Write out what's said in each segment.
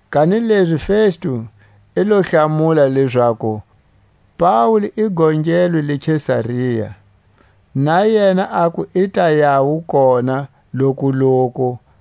Kanilezi Festu i lo hlamula lezaku Paule i gongelwe le Kesaria, na yena aku i ta yawu kona lokuloku.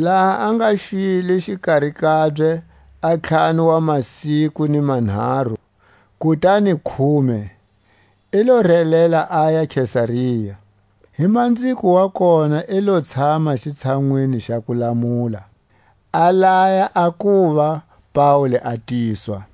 Laha a nga xwile xikari kabye a ntlhanu wa masiku ni manharu kutani khume, i lo relela aya Kesaria; hi manziko wa kona i lo tshama xitshanwini xa kulamula, a laya a kuva Paule a tiswa.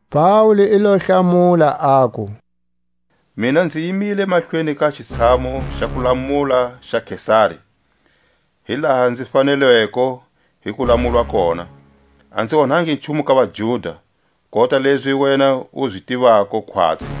Paule i lo hlamula, aku: Mina nzi yimile mahlweni ka xitshamu xa kulamula xa Kesari, hi laha nzi fanelweko hi ku lamulwa kona; a nzi onhangi nchumu ka vaJuda, kota lezi wena u zi tivako khwatsi.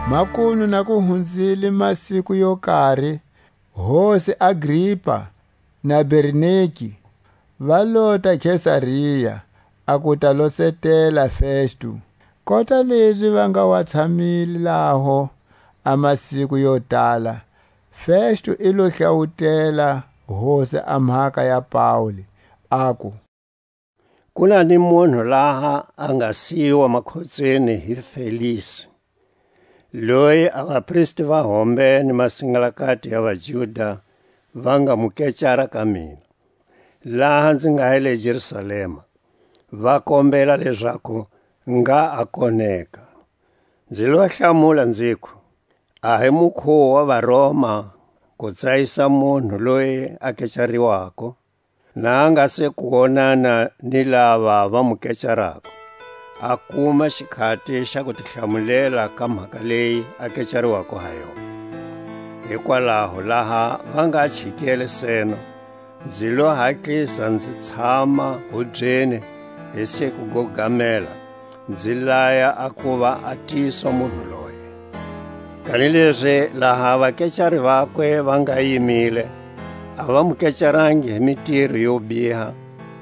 Makunu na ku hunzile masiku yo kari, hosi Agripa na Bernike, va lota Kesaria, a ku ta losetela Festu. Kota lezi va nga wa tshamile laho a masiku yo tala, Festu i lo hlawutela hosi a mhaka ya Paule, aku: Ku na ni munhu laha a nga siyiwa makhotsweni hi Felisi, loyi a vapristi va hombe ni masingalakati ya vaJuda va nga mu kecara ka mina, laha nzi nga hi le Jerusalema, va kombela lezaku ngha a koneka. Nzi lo hlamula nziku, a hi mukhuwo wa vaRoma ku tsayisa munhu loyi a kecariwako, na a nga se ku wonana ni lava va mu kecarako, a kuma xikhati xa ku ti hlamulela ka mhaka leyi a kecariwako ha yona. Hikwalaho laha va nga chikele seno, nzi lo hatlisa nzi tshama hubyeni hi siku go gamela, nzi laya a ku va a tiswa munhu loye. Kanilezi laha a vakecari vakwe va nga yimile, a va mu kecarangi hi mitiro yo biha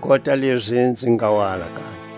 kota lezi nzi nga wa alakanya;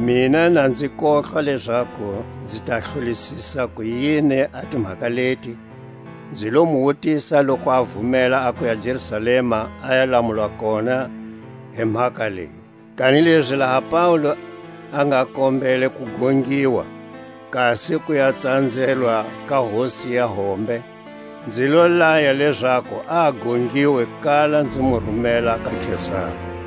Mina na nzi kohlwa lezaku nzi ta hlolisisa kuyini a timhaka leti, nzi lo mu wutisa loku a vumela a kuya Jerusalema a ya lamulwa kona hi mhaka leyi. Kanilezi laha Paule a nga kombele ku gongiwa, kasi ku ya tsanzelwa ka hosi ya hombe, nzi lo laya lezaku a gongiwe kala nzi mu rumela ka Kesari.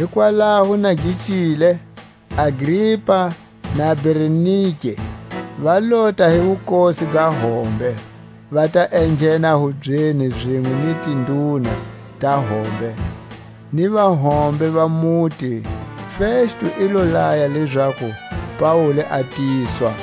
Hikwalaho na gi cile, Agripa na Bernike va lota hi wukosi ga hombe, va ta enghena hubyeni zinwe ni tinduna ta hombe, ni vahombe va muti; Festu i lo laya lezaku Paule a tiswa.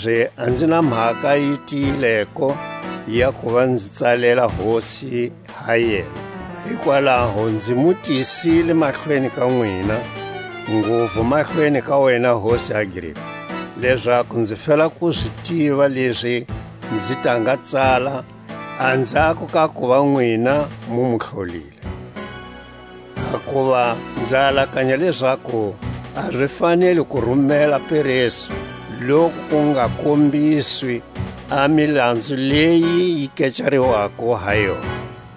Kanilezi a nzi na mhaka yi tiyileko ya kuva nzi tsalela hosi ha yena: hikwalaho nzi mu tisile mahlweni ka nwina, nguvu mahlweni ka wena hosi Agripa, lezaku nzi fela ku zi tiva lezi nzi ta nga tsala anzhako ka kuva nwina mu mu hlolile. Hakuva nza alakanya lezaku a zi faneli ku rumela peresu, loku ku nga kombiswi a milanzu leyi yi kecariwako ha yona.